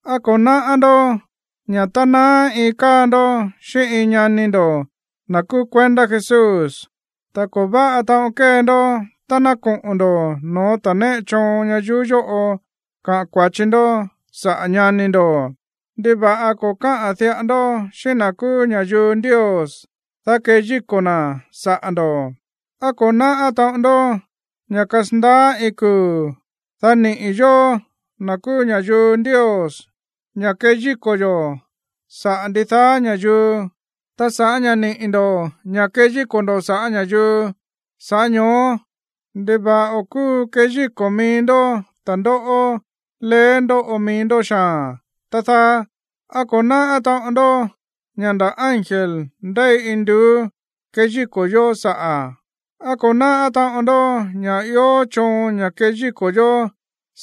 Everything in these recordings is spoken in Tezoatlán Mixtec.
¿Á ko̱ náꞌá ndó ña̱ tá naá iin káa ndó xíꞌín iin ñani ndo̱, na̱ kúú kuendá Jesús, ko̱ váꞌa taꞌon kée ndó tá ná koꞌo̱n ndo̱ no̱ó ta̱a néꞌe choon ñayuú yóꞌo kaꞌa̱n kua̱chi ndó saꞌa̱ ñani ndo̱? ¿Ndiva̱ꞌa ko̱ káꞌa̱n diꞌa ndó xíꞌín na̱ kúú ña̱yuu Ndios, dá keyíko̱ na̱ saꞌa̱ ndo̱? ¿Á ko̱ náꞌá taꞌon ndoꞌó ña̱ kasandaá iin kuu̱, dá niꞌi̱ yóó, na̱ kúú ña̱yuu Ndios, ña̱ keyíko̱ yo̱ saꞌa̱ ndidaá ña̱yuu? Ta sa̱ꞌá ña̱ niꞌi̱ ndo̱ ña̱ keyíko̱ ndo̱ saꞌa̱ ña̱yuu, sa̱ꞌá ño̱ó, ¿ndiva̱ꞌa o̱ kúu keyíko̱ mií ndó ta̱ndóꞌó leé ndóꞌo mií ndó xaa̱n, tá dáá? ¿Á ko̱ náꞌá taꞌon ndoꞌó ña̱ nda̱ ángel ndéi induú keyíko̱ yó saꞌa̱? ¿Á ko̱ náꞌá taꞌon ndó ña̱ ió choon ña̱ keyíko̱ yo̱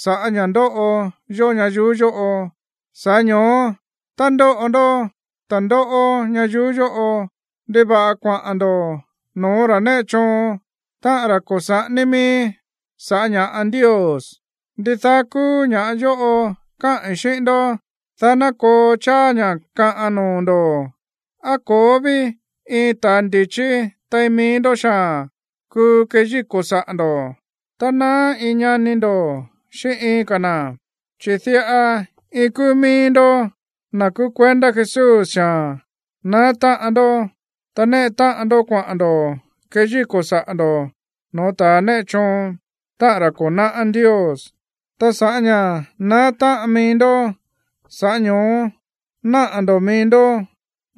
sa̱ꞌá ña̱ ndóꞌo yó ñayuú yóꞌo? Sa̱ꞌá ño̱ó, tá ndóꞌo ndó ta̱ndóꞌó ñayuú yóꞌo, ¿ndiva̱ꞌa kuaꞌa̱n ndo̱ no̱ó ra̱ néꞌe choon, táꞌa̱n ra̱ ko̱ saꞌání mií sa̱ꞌá ña̱ꞌa Ndios? Ndidaá kúú ña̱ yóꞌo káꞌi̱n xíꞌín ndó, dá ná koo cháá ña̱ kaꞌan noo̱ ndo̱. ¿Á ko̱ó ví iin ta̱ ndi̱chí tein mií ndó xaa̱n kuu keyíko̱ saꞌa̱ ndo̱ tá naá iin ñani ndo̱ xíꞌín iin ka̱ na̱? Chi̱ diꞌa iin kúú mií ndó, na̱ kúú kuendá Jesús xaa̱n, naá táꞌan ndó, ta néꞌe táꞌan ndó kuaꞌa̱n ndo̱ keyíko̱ saꞌa̱ ndo̱ no̱ó ta̱a néꞌe choon, táꞌa̱n ra̱ ko̱ náꞌá Ndios. Ta sa̱ꞌá ña̱ naá táꞌan mií ndó, sa̱ꞌá ño̱ó náꞌa̱ ndo̱ mií ndó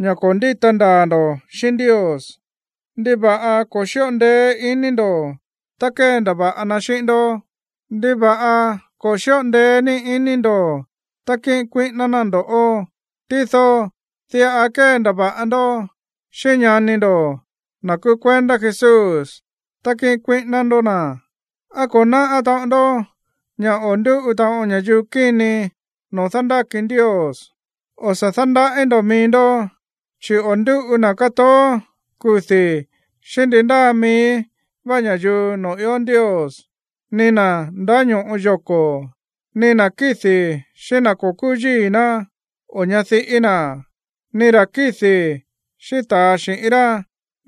ña̱ ko̱ ndíta ndaa̱ ndo̱ xíꞌín Ndios. ¿Ndiva̱ꞌa ko̱ xíꞌo ndeé ní iní ndo̱ tá kéndava̱ꞌa na xíꞌín ndó? Ta, ¿ndiva̱ꞌa ko̱ xíꞌo ndeé ní iní ndo̱ tá kíꞌin kuíꞌíná ná ndo̱ꞌó? Tído diꞌa kéndava̱ꞌa ndó xíꞌín ñani ndo̱, na̱ kúú kuendá Jesús, ta kíꞌin kuíꞌíná ndó na̱. ¿Á ko̱ náꞌá taꞌon ndó ña̱ o̱ ndúꞌu taꞌon ña̱yuu kíni noo̱ dándáki Ndios? O̱ sa̱ dándaꞌí ndo̱ mií ndó, chi̱ o̱ ndúꞌu na̱ kátoó kudi̱ xíꞌín ndi ndáa mií vá ña̱yuu noo̱ ió Ndios, ni na̱ ndáño̱ꞌo yoko̱, ni na̱ kídi̱ xíꞌín na̱ ko̱ kúú yíi̱ ná o ñadiꞌí na̱, ni ra̱ kídi̱ xíꞌín ta̱a xi̱ꞌín rá,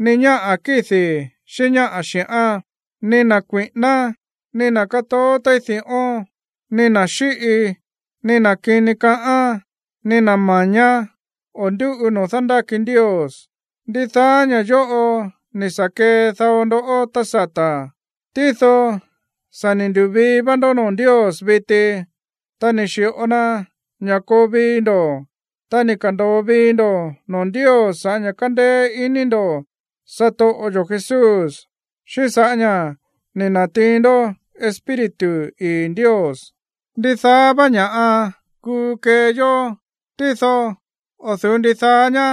ni ñáꞌa̱ kídi̱ xíꞌín ñáꞌa̱ xi̱ꞌán, ni na̱ kui̱ꞌíná, ni na̱ kátoó téí di̱ꞌón, ni na̱ xíꞌi, ni na̱ kini káꞌa̱n, ni na̱ ma̱ñá o̱ ndúꞌu noo̱ dándáki Ndios. Ndidaá ña̱ yóꞌo ni̱ sa̱ kee dao ndoꞌó tá sata̱, tído sa̱ ni̱ ndu̱vii va ndó noo̱ Ndios viti, ta ni̱ xi̱ꞌo na ña̱ koo vii ndo̱, ta ni̱ ka̱ndo̱o vii ndo̱ noo̱ Ndios sa̱ꞌá ña̱ kándéé iní ndo̱ satoꞌo yo̱ Jesús, xíꞌín sa̱ꞌá ña̱ ni̱ na̱tiin ndó Espíritu ii̱ Ndios. Ndidaá vá ña̱ꞌa kuu kee yó, tído o̱ du̱ú ndidaá ñá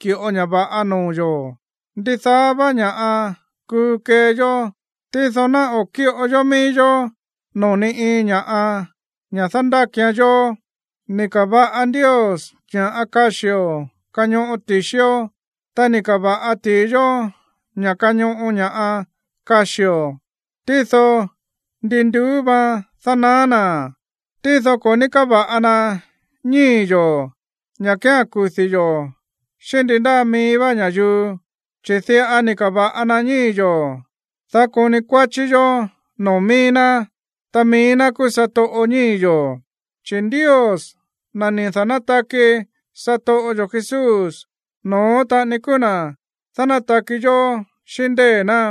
ki̱ꞌo ña̱ va̱ꞌa noo̱ yo̱. Ndidaá vá ña̱ꞌa kuu kee yó, tído ná o̱ kíꞌo yó mií yó noo̱ ni iin ña̱ꞌa ña̱ dándákian yó. Ni̱ ka̱va̱ꞌa Ndios ña̱ꞌa kaxío̱ kañoꞌo ti̱xió, ta ni̱ ka̱va̱ꞌa ti̱i yó ña̱ kañoꞌo ña̱ꞌa kaxío̱, tído ndi nduú vaan dánaá na̱. Tído ko̱ ní káva̱ꞌa na ñíi̱ yo̱ ña̱ kía̱n kudi̱ yo̱ xíꞌín ndi ndáa mií vá ña̱yuu. Chi̱ diꞌa ni̱ ka̱va̱ꞌa na ñíi̱ yo̱, dá koni kuáchí yó noo̱ mií ná, ta mií ná kúú satoꞌo ñíi̱ yo̱. Chi̱ Ndios, na̱ ni̱ da̱nátaki satoꞌo yo̱ Jesús, no̱ón taꞌani kúú na̱ dánátaki yó xíꞌín ndée̱ ná.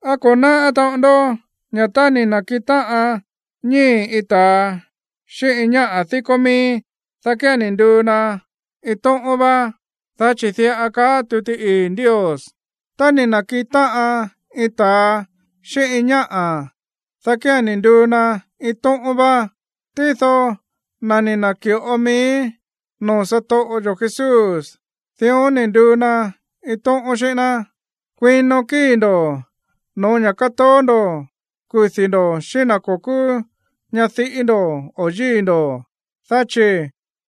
¿Á ko̱ náꞌá taꞌon ndó ña̱ tá ni̱ na̱kiꞌin táꞌan ñíi̱ iin ta̱a xíꞌín ñáꞌa̱ díkó míí, dá kía̱n ni̱ nduu na iin tóꞌón vá? Dá chi̱ diꞌa káꞌa̱n tuti ii̱ Ndios: “Tá ni̱ na̱kiꞌin táꞌan iin ta̱a xíꞌín iin ñáꞌa̱, dá kía̱n ni̱ nduu na iin tóꞌón vá.” Tído na̱ ni̱ na̱ki̱ꞌo mií noo̱ satoꞌo yo̱ Jesús, dión ni̱ nduu na iin tóꞌón xíꞌín ná. Kuino kíi̱ ndo̱ no̱ó ña̱ kátoó ndo̱ kudi̱ ndo̱ xíꞌín na̱ ko̱ kúú ñadiꞌí ndo̱ o yíi̱ ndo̱. Dá chi̱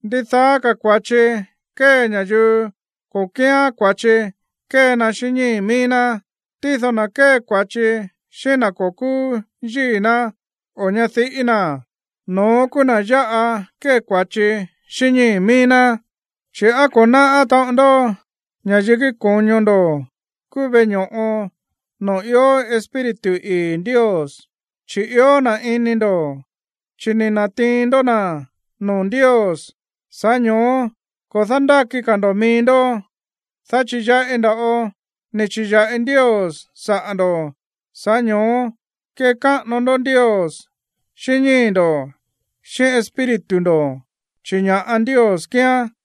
ndidaá ka̱ kua̱chi kée ña̱yuu ko̱ kíán kua̱chi kée na xíꞌín ñíi̱ míí ná, tído na̱ kée kua̱chi xíꞌín na̱ ko̱ kúú yíi̱ ná o ñadiꞌí na̱, no̱ón kúú na̱ yáꞌa kée kua̱chi xíꞌín ñíi̱ míí ná. Chi̱, ¿á ko̱ náꞌá taꞌon ndó ña̱ yikí ko̱ño ndo̱ kúú veꞌe ño̱ꞌo noo̱ ió Espíritu ii̱ Ndios? Chi̱ ió na̱ ini ndo̱, chi̱ ni̱ na̱tiin ndó na̱ noo̱ Ndios. Sa̱ꞌá ño̱ó ko̱ dándáki ka̱ ndo̱ mií ndó, dá chi̱ yaꞌi nda̱ꞌo ni̱ chi̱ya̱ꞌi Ndios saꞌa̱ ndo̱. Sa̱ꞌá ño̱ó kekáꞌano ndó Ndios xíꞌín ñíi̱ ndo̱, xíꞌín espíritu ndo̱, chi̱ ña̱ꞌa Ndios kíán.